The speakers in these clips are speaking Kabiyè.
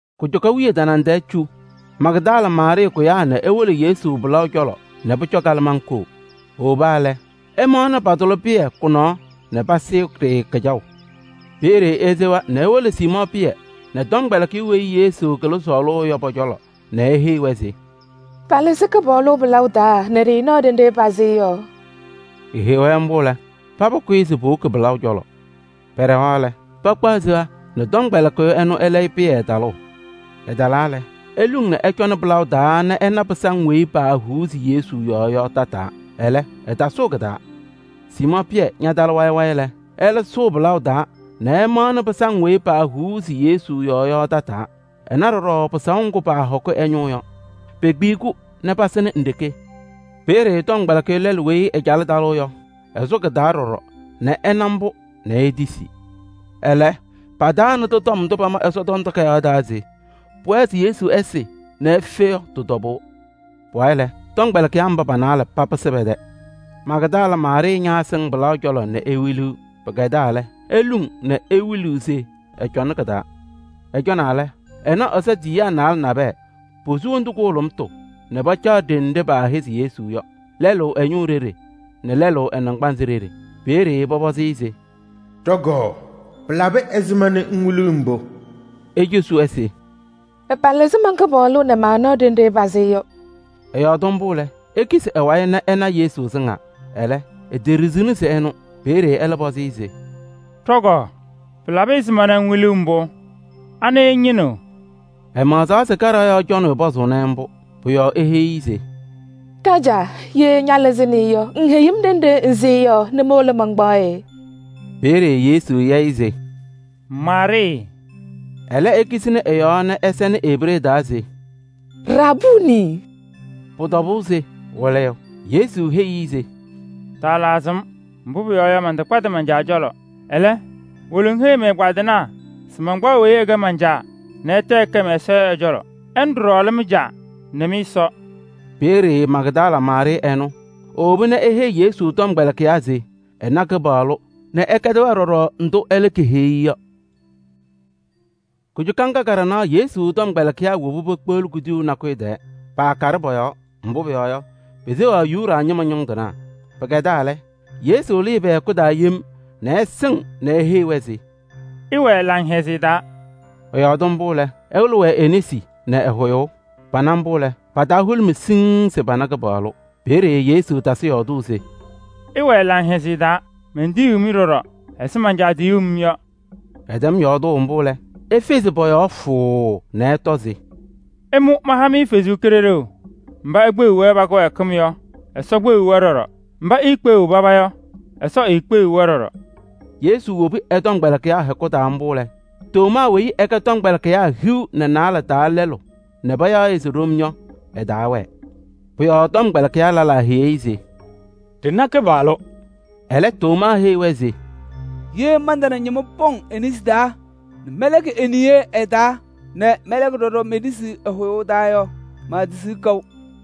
Kujuka wiye tanaŋ tɛɛ cu Magdala Maarɩɩ kʋyaa nɛ ewolo Yesu pɩlaʋ cɔlɔ nɛ pʋcɔ kalɩmaŋ koo. Ewoba lɛ, ɛmaɣnɩ patʋlɩ pɩyɛ kʋ-nɔɔ nɛ pasɩɩ-ɖɩ kɩjaʋ. Peeye esewa nɛ ewolo Siimɔɔ Pɩyɛ nɛ tɔmkpɛlɩkɩyʋ weyi Yesu kɩlɩ sɔɔlʋʋ yɔ pɔ-cɔlɔ nɛ eheyi-wɛ se: “Palɩzɩ Kɩpaɣlʋ ɛ-pɩlaʋ taa nɛ ɖɩɩnaɣ ɖenɖe pasɩ-ɩ yɔ.” Eheyi-wɛ mbʋ lɛ, paba kʋyɩ se powoki pɩlaʋ cɔlɔ. Pɛɖɛɣaɣ lɛ, pakpaɣ seya nɛ tɔmkpɛlɩkɩyʋ ɛnʋ ɛlɛyɩ Pɩyɛ talʋʋ. Ɛtalaa lɛ, eluŋ nɛ ɛcɔnɩ pɩlaʋ taa nɛ ɛna pɩsaŋ weyi paahuuzi Yesu yɔɔ yɔ tataa. Ɛlɛ, ɛtasʋʋ kɩ-taa. Siimɔɔ Pɩyɛ ñatalɩ wayɩ wayɩ lɛ, ɛlɛ sʋʋ pɩlaʋ taa nɛ ɛmaɣnɩ pɩsaŋ weyi paahuuzi Yesu yɔɔ yɔ tataa. Ɛna ɖɔɖɔ pɩsaʋ ŋgʋ paahɔkɩ ɛ-ñʋʋ yɔ. Pekpiyi-kʋ nɛ pasɩnɩ nɖeke. Peeye tɔmkpɛlɩkɩyʋ lɛlʋ weyi ɛcalɩ talʋʋ yɔ, ɛsʋ kɩ-taa ɖɔɖɔ nɛ ɛna mbʋ nɛ etisi. Ɛlɛ, pataanɩdɩ tɔm ndʋ pama Ɛsɔtɔm Takayaɣ taa se pʋwɛɛ se Yesu ɛsɩ nɛ efe yɔ tɩ-tɔbʋʋ. Pʋwayɩ lɛ, tɔmkpɛlɩkɩyaa mba pa-naalɛ papɩsɩ pɛ-tɛ. Magdala Maarɩɩ ñaasɩŋ pɩlaʋ cɔlɔ nɛ ewiliɣ. Pɩkɛdaa lɛ, eluŋ nɛ wiluu se ɛcɔŋnɩ kɩ-taa. Ɛcɔnaa lɛ, ɛna Ɛsɔ tiyiyaa naalɛ nabɛyɛ, posu wondu kʋhʋlʋmʋtʋ nɛ pacaɣ ɖenɖe paahɛzɩ Yesu yɔ: lɛlʋ ɛ-ñʋʋ ɖeɖe nɛ lɛlʋ ɛ-naŋgbanzɩ ɖeɖe. Peeye pɔpɔzɩ-ɩ se: “Ɖɔ-kɔɔ! Pɩlabɩ ɛzɩma nɛ ŋwiliɣ mbʋ?” Ecosi-wɛ se: “Palɩzɩ man-Kɩpaɣlʋ nɛ maanaɣ ɖenɖe pasɩ-ɩ yɔ.” Ɛyɔɔdɩ mbʋ lɛ, ekisi ɛ-wayɩ nɛ ɛna Yesu sɩŋaa. Ɛlɛ, eteɖiɣzini se ɛnʋ. Peeye ɛlɛ pɔzɩ-ɩ se: “Ɖɔ-kɔɔ! Pɩlabɩ ɛzɩma nɛ ŋwiliɣ mbʋ? Anɩ ŋñɩnɩɣ?” Ɛmaɣzaɣ se kaɖaɣ yɔɔ cɔnɩyʋ pɔzʋʋnɩ-ɩ mbʋ. Pʋ-yɔɔ eheyi-i se: “Ɖajaa! Ye ñalɩzɩnɩ-ɩ yɔ, ŋheyi-m ɖenɖe ŋsɩ-ɩ yɔ nɛ mowolo mankpaɣ-ɩ.” Peeye Yesu ya-ɩ se: “Maarɩɩ!” Ɛlɛ ekisini ɛ-yɔɔ nɛ ɛsɛnɩ Ebree taa se: “Rabuunii!” Pʋ-tɔbʋʋ se Wɩlɩyʋ. Yesu heyi-i se: “Taatukuni-m mbʋ, mbʋ pʋyɔɔ yɔ, mantakpadɩ man-Caa cɔlɔ. Ɛlɛ, wolo ŋheyi mɛ-ɛgbaadɩnaa se mankpaɣ weyi ɛkɛ man-Caa nɛ ɛtɛ ɛkɛ mɛ-Ɛsɔ yɔ ɛ-cɔlɔ. Ɛnʋ ɖɔɖɔ lɛ mɩ-Caa nɛ mɩ-Ɛsɔ.” Peeye Magdala Maarɩɩ ɛnʋ ewoba nɛ eheyi Yesu tɔmkpɛlɩkɩyaa se ɛna Kɩpaɣlʋ nɛ ɛkɛdɩ-wɛ ɖɔɖɔ ndʋ ɛlɛ keheyi-i yɔ. Kujuka ŋga ka-ɖanaɣ Yesu tɔmkpɛlɩkɩyaa woba pekpeɣli kuduyuu nakʋyʋ tɛɛ. Paakaɖɩ pɔ-yɔɔ, mbʋ pʋyɔɔ yɔ, peseɣaɣ Yuda ñɩma ñʋŋ tɩnaa. Pɩkɛdaa lɛ, Yesu lɩɩ pɛ-hɛkʋ taa yem nɛ ɛsɩŋ nɛ eheyi-wɛ se: “Ɩwɛɛ laŋhɛzɩyɛ taa!” Ɛyɔɔdɩ mbʋ lɛ, ɛwɩlɩ-wɛ e-nesi nɛ ɛ-hʋyʋʋ. Pana mbʋ lɛ, pa-taa hʋlʋmɩ siŋŋ se pana Kɩpaɣlʋ. Peeye Yesu tasɩ yɔɔdʋʋ se: “Ɩwɛɛ laŋhɛzɩyɛ taa! Mentiyiɣ-mɩ ɖɔɖɔ ɛzɩ man-Caa tiyuu-m yɔ.” Ɛtɛm yɔɔdʋʋ mbʋ lɛ, efezi pɔ-yɔɔ fʋʋʋ nɛ ɛtɔ se: “Ɩmʋ maha-mɩ Ɛsɔ Kalɩzaɣ! Mba ikpeɣiɣ-wɛ pa-kɩwɛɛkɩm yɔ, Ɛsɔ kpeɣiɣ-wɛ ɖɔɖɔ. Mba iikpeɣiɣ paba yɔ, eekpeɣiɣ-wɛ ɖɔɖɔ.” Yesu wobi ɛ-tɔmkpɛlɩkɩyaa hɛkʋ taa mbʋ lɛ, Tomaa weyi ɛkɛ ɛ-tɔmkpɛlɩkɩyaa hiu nɛ naalɛ taa lɛlʋ nɛ payaɣ-ɩ se Ɖom yɔ, ɛtaawɛɛ. Pʋ-yɔɔ tɔmkpɛlɩkɩyaa lɛlaa heyi-i se: “Ɖɩna Kɩpaɣlʋ.” Ɛlɛ, Tomaa heyi-wɛ se: “Ye mantana ñɩma pɔŋ e-nesi taa nɛ mɛlɛkɩ me-niye ɩ-taa nɛ mɛlɛkɩ ɖɔɖɔ me-nesi ɛ-hʋyʋʋ taa yɔ, maatisiɣ kaʋ.”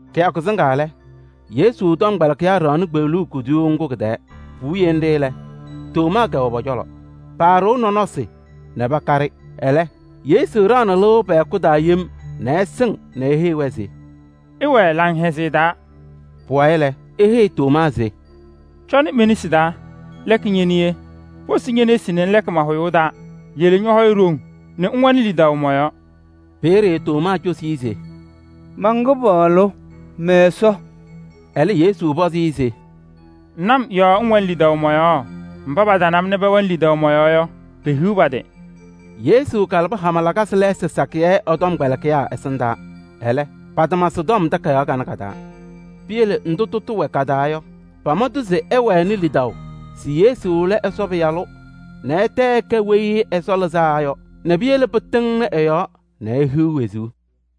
Kɩyakʋ sɩŋaa lɛ, Yesu tɔmkpɛlɩkɩyaa ɖaɣnɩ kpeɣluu kuduyuu ŋgʋ kɩ-tɛɛ. Puwiye nɖɩ lɛ, Tomaa kɛwɛ pɔ-cɔlɔ. Paaɖɩɣ nɔnɔsɩ nɛ pakaɖɩ. Ɛlɛ, Yesu ɖaɣnɩ lɩʋ pɛ-hɛkʋ taa yem nɛ ɛsɩŋ nɛ eheyi-wɛ se: “Ɩwɛɛ laŋhɛzɩyɛ taa!” Pʋwayɩ lɛ, eheyi Tomaa se: “Cɔnɩ me-nesi taa, lɛkɩ ñe-niye, posi ñe-nesi nɛ ŋlɛkɩ ma-hʋyʋʋ taa. Yele ñɔ-hɔyɛ ɖoŋ nɛ ŋwɛnɩ lidaʋ mɔ-yɔɔ.” Peeye Tomaa cosi-i se: “Man-Kɩpaɣlʋ! Mɛ-Ɛsɔ!” Ɛlɛ Yesu pɔzɩ-ɩ se: “Ŋna-m yɔɔ ŋwɛnɩ lidaʋ mɔ-yɔɔ? Mba patana-m nɛ pɛwɛnɩ lidaʋ mɔ-yɔɔ yɔ, pehiɣ pa-tɩ!” Yesu kalabɩ hama lakasɩ lɛɛsɩ sakɩyɛ ɛ-tɔmkpɛlɩkɩyaa ɛsɩndaa, ɛlɛ, patama sɩ-tɔm takayaɣ kanɛ ka-taa. Piyele ndʋ tʋtʋ wɛ ka-taa yɔ, pama-tʋ se ɩwɛnɩ lidaʋ se Yesu lɛ Ɛsɔ Pɩyalʋ nɛ ɛtɛ ɛkɛ Weyi Ɛsɔ Lɩzaa Yɔ nɛ piyele pɩtɩŋnɩ ɛ-yɔɔ nɛ ihiɣ wezuu.